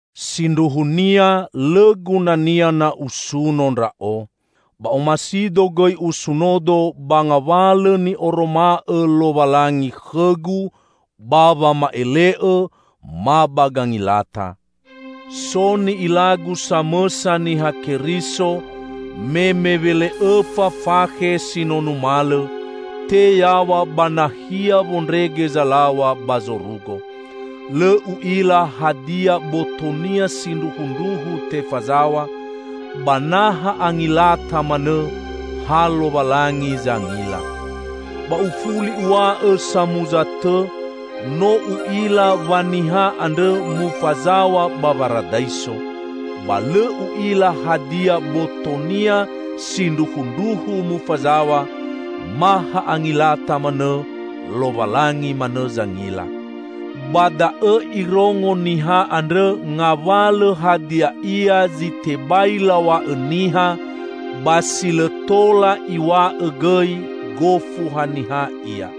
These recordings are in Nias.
Sindruhunia lõ gunania na usuno ndra'o. Ba omasido gõi usunodo ba ngawalõ ni'oroma'õ Lowalangi khõgu ba wama'ele'õ ma ba gangilata. So ni'ilagu samõsa Niha Keriso me mewele'õfa fakhe si no numalõ, te yaw̃a ba nahia wondrege zalaw̃a ba zorugo. (Lõ u'ila hadia botonia sindruhundruhu tefazaw̃a, ba na ha angilata manõ, ha Lowalangi zangila.) Ba ufuli uw̃a'õ samuza tõ: No u'ila wa niha andrõ mufazaw̃a ba Waradaiso. (Ba lõ u'ila hadia botonia sindruhundruhu mufazaw̃a, ma ha angilata manõ -- Lowalangi manõ zangila). Ba da'õ irongo niha andrõ ngawalõ hadia ia zi tebai law̃a'õ niha, ba si lõ tola iw̃a'õ gõi, gofu haniha ia.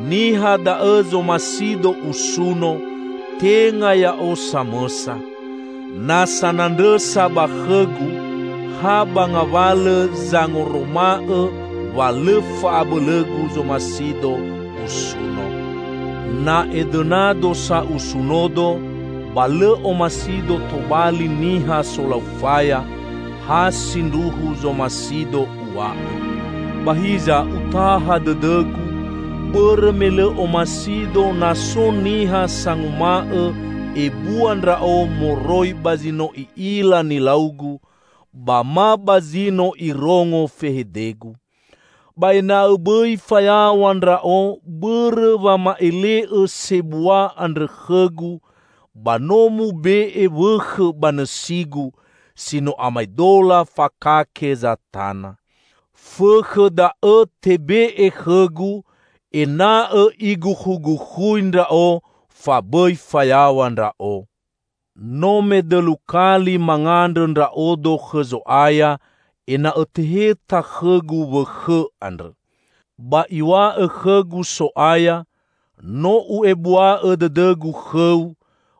Niha da'õ zomasido usuno, tenga ya'o samõsa. Na sanandrõsa ba khõgu, ha ba ngawalõ zangoroma'õ wa lõ fa'abõlõgu zomasido usuno. Na edõnado sa usunodo, ba lõ omasido tobali niha solau faya; ha sindruhu zomasido uw̃a'õ. Ba hiza utaha dõdõgu, bõrõ me lõ omasido na so niha sanguma'õ ebua ndra'o moroi ba zi no i'ila nilaugu, ba ma ba zi no irongo fehedegu. Ba ena'õ bõi fayaw̃a ndra'o bõrõ wama'ele'õ sebua andrõ khõgu, ba no mube'e wõkhõ ba nõsigu, si no amaedola fakake Zatana. Fõkhõ da'õ tebe'e khõgu, ena'õ igukhugukhui ndra'o, fa bõi fayaw̃a ndra'o. No medõlu kali mangandrõ ndra'odo khõ Zo'aya ena'õ teheta khõgu wõkhõ andrõ. Ba Iw̃a'õ khõgu So'aya, "No U'ebua'õ dõdõ-Gu khõu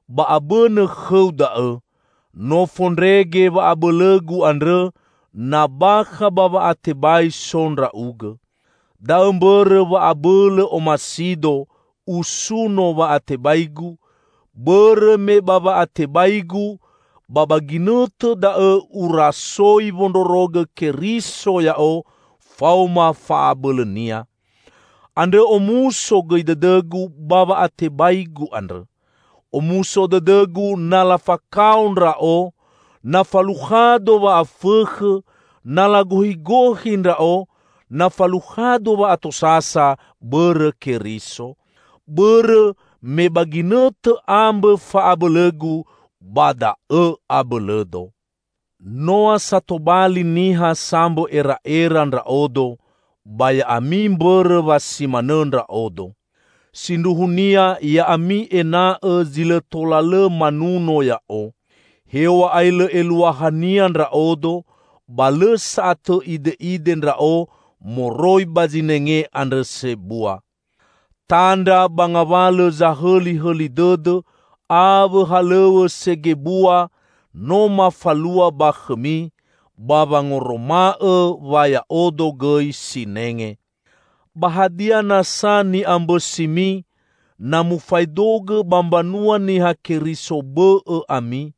ba abõnõ khõu da'õ; no fondrege wa'abõlõ-Gu andrõ na bakha ba wa'atebai so ndra'ugõ." Da'õ mbõrõ wa abõlõ omasido usuno wa'atebaigu, bõrõ me ba wa'atebaigu, ba ba ginõtõ da'õ urasoi wondrorogõ Keriso ya'o faoma fa'abõlõ-Nia. Andrõ omuso gõi dõdõgu ba wa'atebaigu andrõ. Omuso dõdõgu na lafakao ndra'o, na falukhado wa'afõkhõ, na lagohigohi ndra'o, na falukhado wa'atosasa bõrõ Keriso. Bõrõ me ba ginõtõ ambõ fa'abõlõgu, ba da'õ abõlõdo. Noa sa tobali niha sambõ era'era ndra'odo -- ba ya'ami mbõrõ wa si manõ ndra'odo. Sindruhunia ya'ami ena'õ zi lõ tõla lõ manuno ya'o. Hew̃a'ae lõ eluahania ndra'odo, ba lõ sa'atõ ide'ide ndra'o moroi ba "zinenge" andrõ sebua! Tandra ba ngawalõ zahõlihõli dõdõ awõ halõw̃õ segebua no mafalua ba khõmi, ba wangoroma'õ wa ya'odo gõi sinenge. Ba hadia nasa ni'ambõsimi, na mufaedogõ ba mbanua Niha Keriso bõ'õ ami?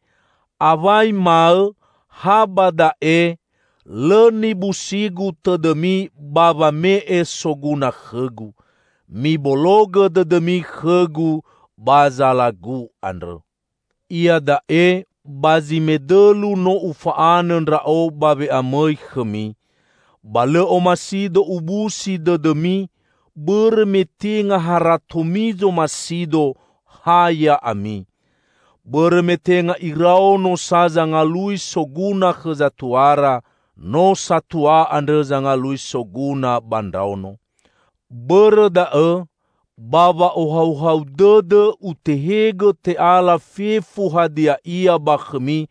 Awai maõ, ha ba da'e: lõ nibusigu tõdõmi ba wame'e soguna khõgu. Mibologõ dõdõmi khõgu ba zalagu andrõ. Iada'e ba zi medõlu no ufa'anõ ndra'o ba we'amõi khõmi. Ba lõ omasido ubusi dõdõmi, bõrõ me tenga haratomi zomasido, ha ya'ami. Bõrõ me tenga iraono sa zangalui soguna khõ zatuara, no satua andrõ zangalui soguna ba ndraono. Bõrõ da'õ, ba wa'ohauhau dõdõ utehegõ te'ala fefu hadia ia ba khõmi,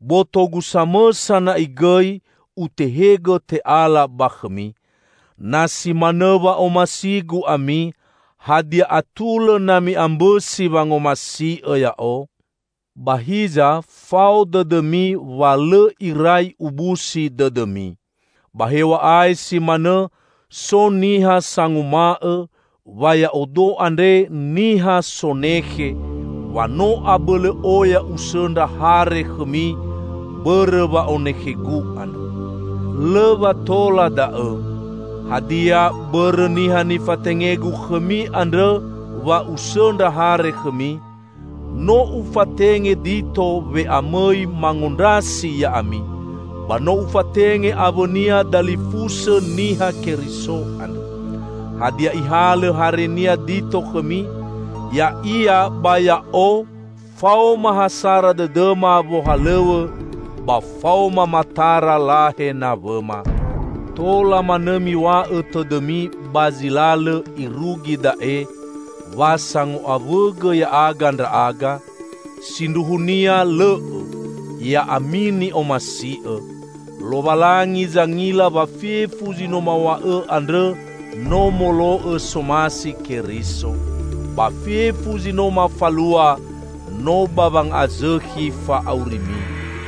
botogu samõsa na'i gõi utehegõ te'ala ba khõmi. Na si manõ wa'omasigu ami, hadia atulõ na mi'ambõsi wangomasi'õ ya'o? Ba hiza fao dõdõmi wa lõ irai ubusi dõdõmi. Ba hew̃a'ae si manõ, so niha sanguma'õ wa ya'odo andre niha sonekhe; wa no abõlõ oya usõndra hare khõmi, bõrõ wa'onekhegu andrõ. Lõ wa tola da'õ! Hadia, bõrõ niha nifatengegu khõmi andrõ wa usõndra hare khõmi? No ufatenge Dito we'amõi mangondrasi ya'ami, ba no ufatenge awõnia dalifusõ Niha Keriso andrõ. Hadia ihalõ harenia Dito khõmi? Ya'ia ba ya'o faoma ha sara dõdõma wohalõw̃õ, ba faoma matara lahe nawõma! Tola manõ miw̃a'õ tõdõmi ba zi lalõ irugi da'e, wa sango'awõgõ ya'aga ndra'aga? Sindruhunia lõ'õ, ya'ami ni'omasi'õ! Lowalangi zangila wa fefu zi no maw̃a'õ andrõ no molo'õ somasi Keriso. Ba fefu zi no mafalua no ba wanga'azõkhi fa'aurimi.